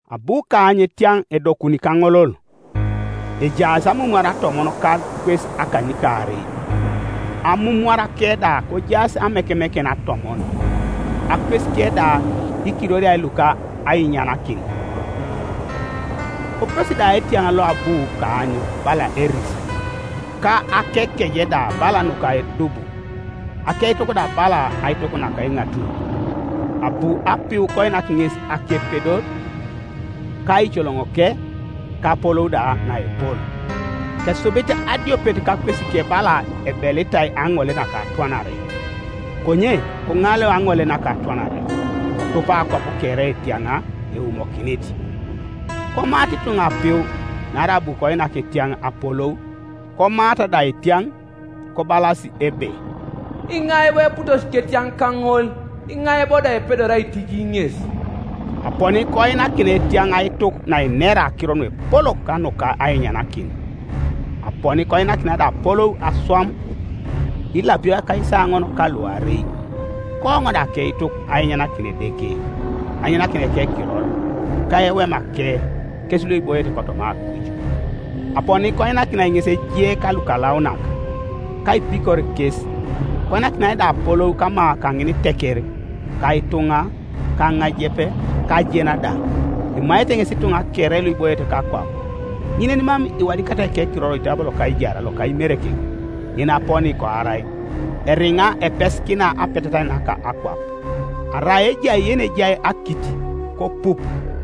Abu kaany etiaŋ edokuni kaŋolol, ejaas amumwara atomon ka akwes akanykaarei, amumwarake da kojaas amekemeken atomon, akwesike da ikiroria luka ainyanakin. Koputosi da etiaŋ loabu kaany bala eris, ka akekeje da bala nuka edubu, akeituk da bala aituk naka eŋatuny. Abu apiu koinak ŋes akepedor, ka eicoloŋoke, ka apolou da naepol. Kesubit adiopet kakwesike bala ebelitai aŋole naka atwanare, konye koŋaleu aŋole naka atwanare, kotupa akwap kere etiaŋ eumokinit. Komaata ituŋa apiu, naarai abu koinak etiaŋ apolou, komaata da etiaŋ, kobalas ebe, “Iŋai bo eputosi ketiaŋ kaŋol, iŋai bo da epedori aitiji ŋes?” Aponi koinakinai etiaŋ aituk nainera akiro nuepolok ka nuka ainyanakin, aponi koinakinai da apolou aswam ilapio akaisaoŋon ka luarei. Kooŋ da akeituk ainyanakin Edeke, ainyanakin ekekiror, ka ewemake, kes luiboiete kotoma akuj. Aponi koinakinai ŋes ejie ka lukalaunak, ka aipikor kes, koinakinai da apolou kama kaŋiniteker, ka ituŋa, ka aŋajep, ka ajena da. Emaete ŋes ituŋa kere luiboiete kakwap, ŋin yenimam iwadikatai ekirorike oitabo loka aijar loka Imerekek yenaponi koarai, eriŋa epesikina apetetait naka akwap, Arai ejai yenejai akit, kopup: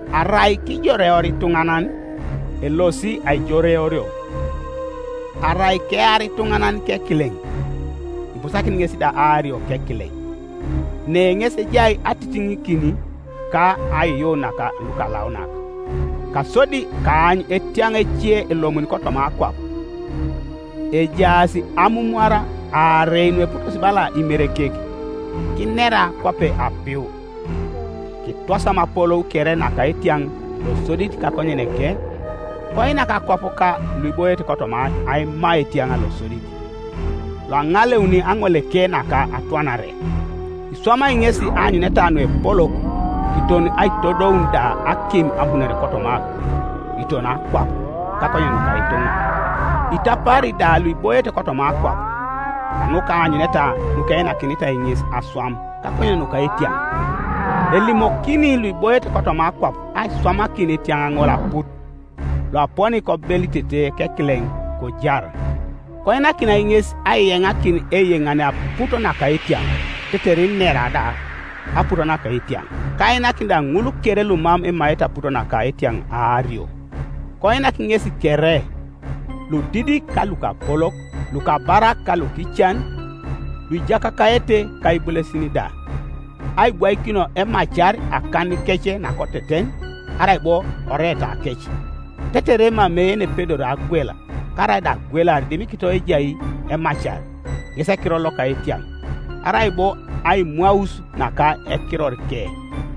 Arai kijoreor ituŋanan, elosi aijoreorio, Arai kear ituŋanan kekileŋ, ibusakinit ŋes da aario kekileŋ, Ne ŋes ejai atitiŋikin ka aiyuun naka lukalaunak. Kasodi kaany etiaŋ ece elomuni kotoma akwap; ejaas amumwara aarei nueputosi bala imerekek, kinera kwape apiu, Kitwasam apolou kere naka etiaŋ losodit kakonyeneke. Koinak akwap ka luiboiete kotoma aima etiaŋ losodit, loaŋaleuni aŋoleke naka atwanare. Iswamai ŋesi aanyuneta nuepolok, kiton aitodoun da akim abunore kotoma akuj, kiton akwap, kakonyen nuka ituŋa. Itapaari da luiboiete kotoma akwap, kanuka aanyuneta nukeinakinitai ŋes aswam kakonyen nuka etiaŋ, elimokini luiboiete kotoma akwap aiswamakin etiaŋ ŋol aput, loaponi kobelitete kekileŋ, kojar. Koinakinai ŋes aiyeŋakin eiyeŋane aput naka etiaŋ, tetere inera da aput naka etiaŋ, ka ainakin da ŋul kere lumam emaete aput naka etiaŋ aario. Koinak ŋesi kere, ludidik ka lukapolok, lukabarak ka lukican, luijakakaete, ka ibulesin da, aibwaikinio emacar akanikec nakoteten, arai bo oreetakec, tetere emamei yenepedori agwel karaida agwelar dimikito ejai emacar, ŋes ekiror loka etiaŋ, arai bo aimwaus naka ekirorike.